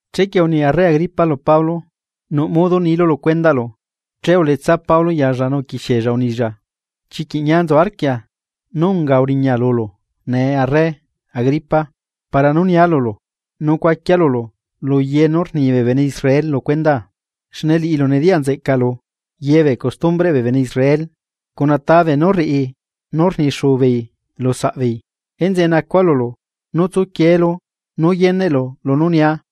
Chequie uni arre Agripa lu Pablo: ―Nuꞌ modo nilu lu cuendaꞌlu. Che uletsa Pablo yalla nu uquixiella unilla: ―Chiquiꞌ ñia nzu arquia nú unga uriña lulu nee arre Agripa para nú nia lulu, nu cuaquia lulu ye nú rni bee bene Israel lu cuendaa. Xne liꞌilu nediyaꞌnzeꞌcalu ye bee costumbreꞌ bee bene Israel cuna ta beenú rriꞌi nú rnixuu beei lu saꞌbeei. Enzeꞌe nacua lulu nú tsuquieelu nu yeneꞌlu lunú nia.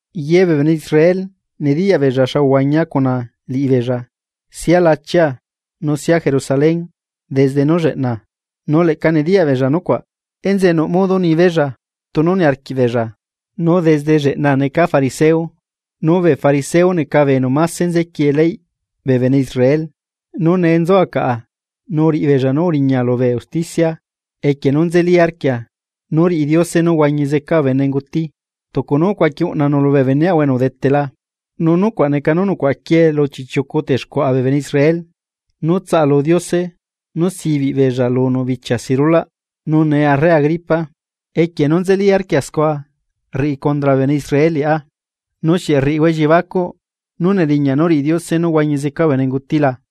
’Ye bee bene Israel nediyaꞌ beella xa uhuañia cuna liꞌibeella sia lachia nu sia Jerusalén desde nú lleꞌna, nu leꞌca nediyaꞌbeella nucuaꞌ, enzeꞌe nuꞌ modo nibeella tunu niarquiꞌbeella, nu desde lleꞌna neca fariseo, nu bee fariseo neca bee enu máse nzequiee leyꞌ bee bene Israel. Nu nee nzua caꞌa nu uriꞌibeella nú uriña lubee usticia equie nu nzeli arquia nú riꞌi Diose nú huañi zeca bee benenguti, tucu nu ucuaqui uꞌnanu lubee beneꞌahua enu udetela. Nu nucuaꞌ neca nú nucuaꞌaquiee lu chiꞌchiucu texcuaꞌa bee bene Israel nú tsaꞌalu Diose nú sibiꞌ beella lunu bichia si rulaꞌ, nu nee arre Agripa, equie nú nzeli arquia scua rriꞌi condra bee bene Israel liꞌá. ¿Nu xieꞌ rriꞌihua elliebacuꞌ nú neriñaꞌ nú riꞌi Diose nú huañi zeca bee benenguti la?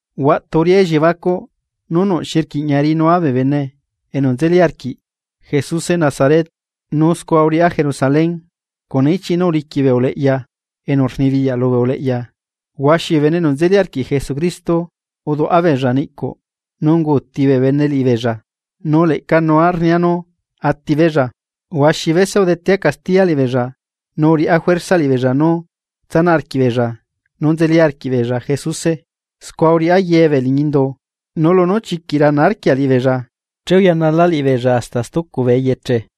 ’Huaꞌtu uriꞌá elliebacuꞌ nú nuꞌ xi rquiꞌña riꞌinua bee bene enu nzeli arquiꞌ Jesuse Nazaret, nu scua uriꞌá Jerusalén. Cuna ichiꞌ nú uliquiꞌ bee uleꞌya enu rnibiyaꞌ lubee uleꞌya, huaxi bee bene enu nzeli arquiꞌ Jesucristo uduꞌa beella niꞌcuꞌ, nu unguuti bee bene liꞌibeella, nu leꞌcanua rnia nú atibeella. Huaxi bese udetea castiya liꞌibeella nu uriꞌá juerza liꞌibeella nú tsanaꞌ arquiꞌbeella nú nzeli arquiꞌbeella Jesuse, scua uriꞌá ye bee liñi indu, nu lunú chiquiꞌ rana arquia liꞌibeella che uyanala liꞌibeella hasta stucu bee eyeche.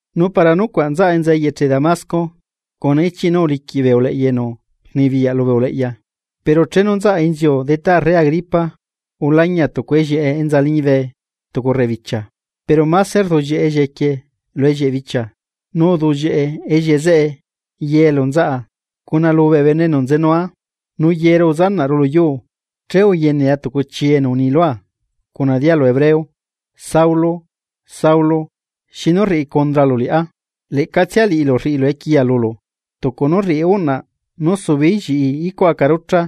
’Nu para nucuaꞌ nzaꞌa enza eyeche Damasco, cuna ichiꞌ nú uliquiꞌ bee uleꞌya enu rnibiyaꞌ lubee uleꞌya. Pero chenu nzaꞌa inziu detá arre Agripa ulañia tucu ellieꞌe enza liñibe tucu rrebibichia, pero máse rduꞌllieꞌe ellieꞌe quie lu ellieꞌ bichia, nu uduꞌllieꞌe ellieꞌe zeꞌe ye elu nzaꞌa cuna lubee bene enu nzenua. Nu yeru uzanaꞌru luyuu, che uyenea tucu chi enu uni lua cuna dialu hebreo: “Saulo, Saulo, ¿xinu rriꞌi condralu liꞌá? Leꞌcatsia liꞌilu rriꞌilu equiya lulu, tucu nú rriꞌi uꞌnaꞌ nú subeeí lliꞌi icuꞌ aca rucha.”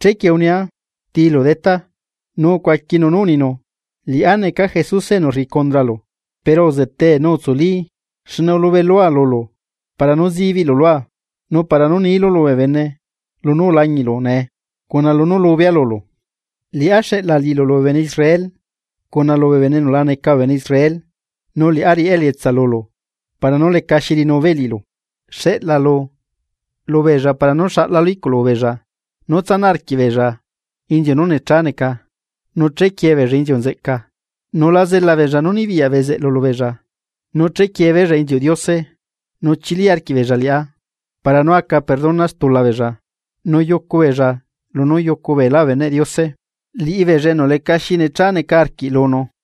Chequie unia: “¿Tilu Detá?” Nu ucuaquinu nú uninu: “Liꞌá neca Jesuse enu rriꞌi cundralu. Pero uzetee nu utsuli, xne ulubelua lulu para nú zibiꞌlu lua nu para nú niilu lubee bene lunú ulañiꞌlu nee cuna lunú lubea lulu. Liꞌá xeꞌla liꞌilu lubee bene Israel, cuna lubee bene enu la neca bee bene Israel, nu liꞌá riꞌá elietsa lulu para nú lecaxi riꞌinubeei liꞌilu, Xeꞌlaalu lubeella para nú xaꞌlalu iꞌculubeella nú tsanaꞌ arquiꞌbeella inziu nú necha neca, nu chequiee beella inziu nzeꞌca. Nu la zela beella nú nibiyaꞌ bezeꞌlu lubeella nú chequiebeella inziuꞌ Diose, nu chili arquiꞌbeella liꞌá para nú aca perdona stula beella nu yucubeella lunú yucu beelá beneꞌ Diose, liꞌibeella enu lecaxi necha neca arquiꞌ lunu.”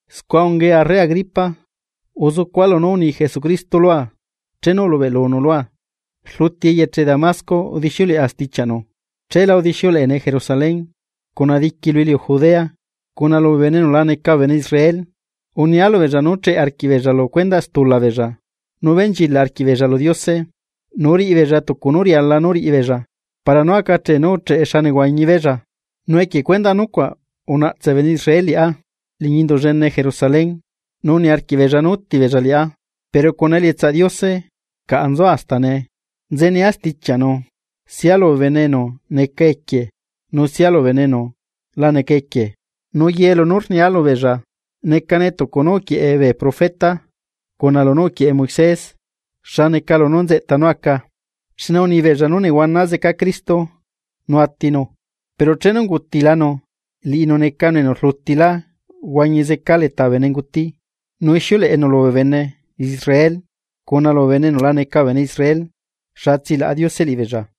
’Scua ungae arre Agripa, uzucua lunú uni Jesucristo lua chenu ulubeꞌlunu lua. Rluti eyeche Damasco udixiuleꞌa stichiaꞌnu, cheelá udixiuleꞌene Jerusalén cuna diqui lu iliu Judea, cuna lubee bene enu la neca bee bene Israel, unia lubeella nú cheꞌe arquiꞌbeella lu stula beella nu benchilaꞌ arquiꞌbeella lu Diose, nu riꞌibeella tucu nú riala nú riꞌibeella para nú acachee nú ucheꞌe xa nehuañibeella. Nu equie cuendaꞌ nucuaꞌ unaꞌtse bee bene Israel liꞌá liñi Indu llene Jerusalén, nu niarquiꞌbeella nú útibeella liꞌá. Pero cuna elietsaꞌ Diose caꞌa nzua hasta nee, nzenia stichiaꞌnu sia lubee bene enu neca equie nu sia lubee bene enu la neca equie. Nu ye lunú rnia lubeella necane tucu nú uquieꞌe bee profeta cuna lunú uquieꞌe Moisés xa neca lunú nzeꞌta nú aca, xne unibeella nú nehuana zeca Cristo nu atinu. Pero chenu ungutilanu, liꞌinu necanu enu rlutilá uhuañi zeca leta bee benenguti, nu ixiuleꞌenu lubee bene Israel cuna lubee bene enu la neca bee bene Israel xa tsilaꞌa Diose liꞌibeella.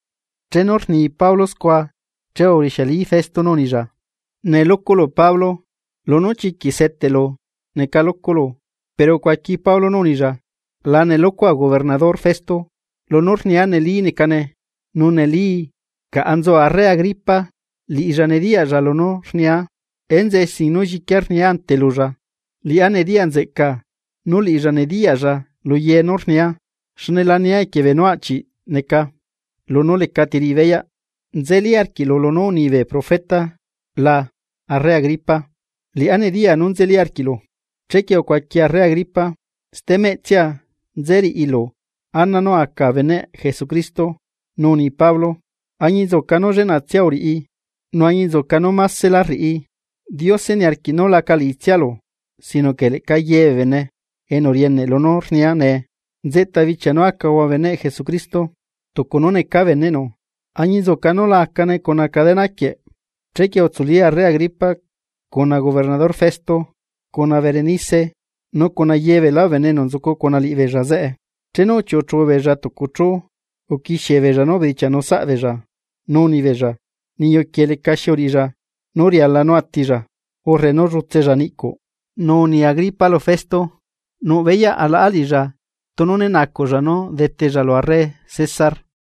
Chenu rni Pablo scua, che urixiali Festo nú unilla: ―¡Nelocolo Pablo! Lunú chiquiꞌ seteꞌlu nelocolo. Pero ucuaqui Pablo nú unilla: ―La nelocoa gobernador Festo. Lunú rnia neli necane, nu nelii. Caꞌa nzu arre Agripa, liꞌilla nediyaꞌlla lunú rnia, enzeꞌe sin nú lliquia rnia ante lulla. Liꞌá nediyanzeꞌca nú liꞌilla nediyaꞌlla luye nú rnia xne lania equie beenú aꞌchi neca lunú leca tiriꞌibeyaꞌ. ¿Nzelí arquiꞌlu lunú uni bee profeta la arre Agripa? Liꞌá nediya nú nzeli arquiꞌlu. Chequie ucuaqui arre Agripa: ―Stemeꞌtsia nze riꞌilu ana nú a aca beneꞌ Jesucristo. Nu uni Pablo: ―Añinzuca nu lleꞌnatsia uriꞌi, nu añinzuca nú másela rriꞌi, Diose niarquiꞌ nú laca liꞌitsialu, sinoque leꞌca ye bee bene enu rieneꞌ lunú rnia nee, nzeꞌta bichia nú acahua beneꞌ Jesucristo tucu nú necaa beneꞌnu, añinzuca nú la acane cuna cadena quieꞌ. Chequie utsuli arre Agripa, cuna gobernador Festo cuna Berenice nu cuna ye beelá bee bene enu nzucu cuna liꞌibeella zeꞌe. Chenu uchiuꞌuchu beella tucu chú uquixiebeella nú ubedichianu saꞌbeella. Nu rnibeella: ―Niyu quieꞌ lecaxi uriꞌilla nú riala nú atilla, urre nú llutsella niꞌcuꞌ. Nu uni Agripa lu Festo: ―Nuꞌbeyaꞌ alaꞌa liꞌilla tunu né nacuꞌlla nú detella lu arre César.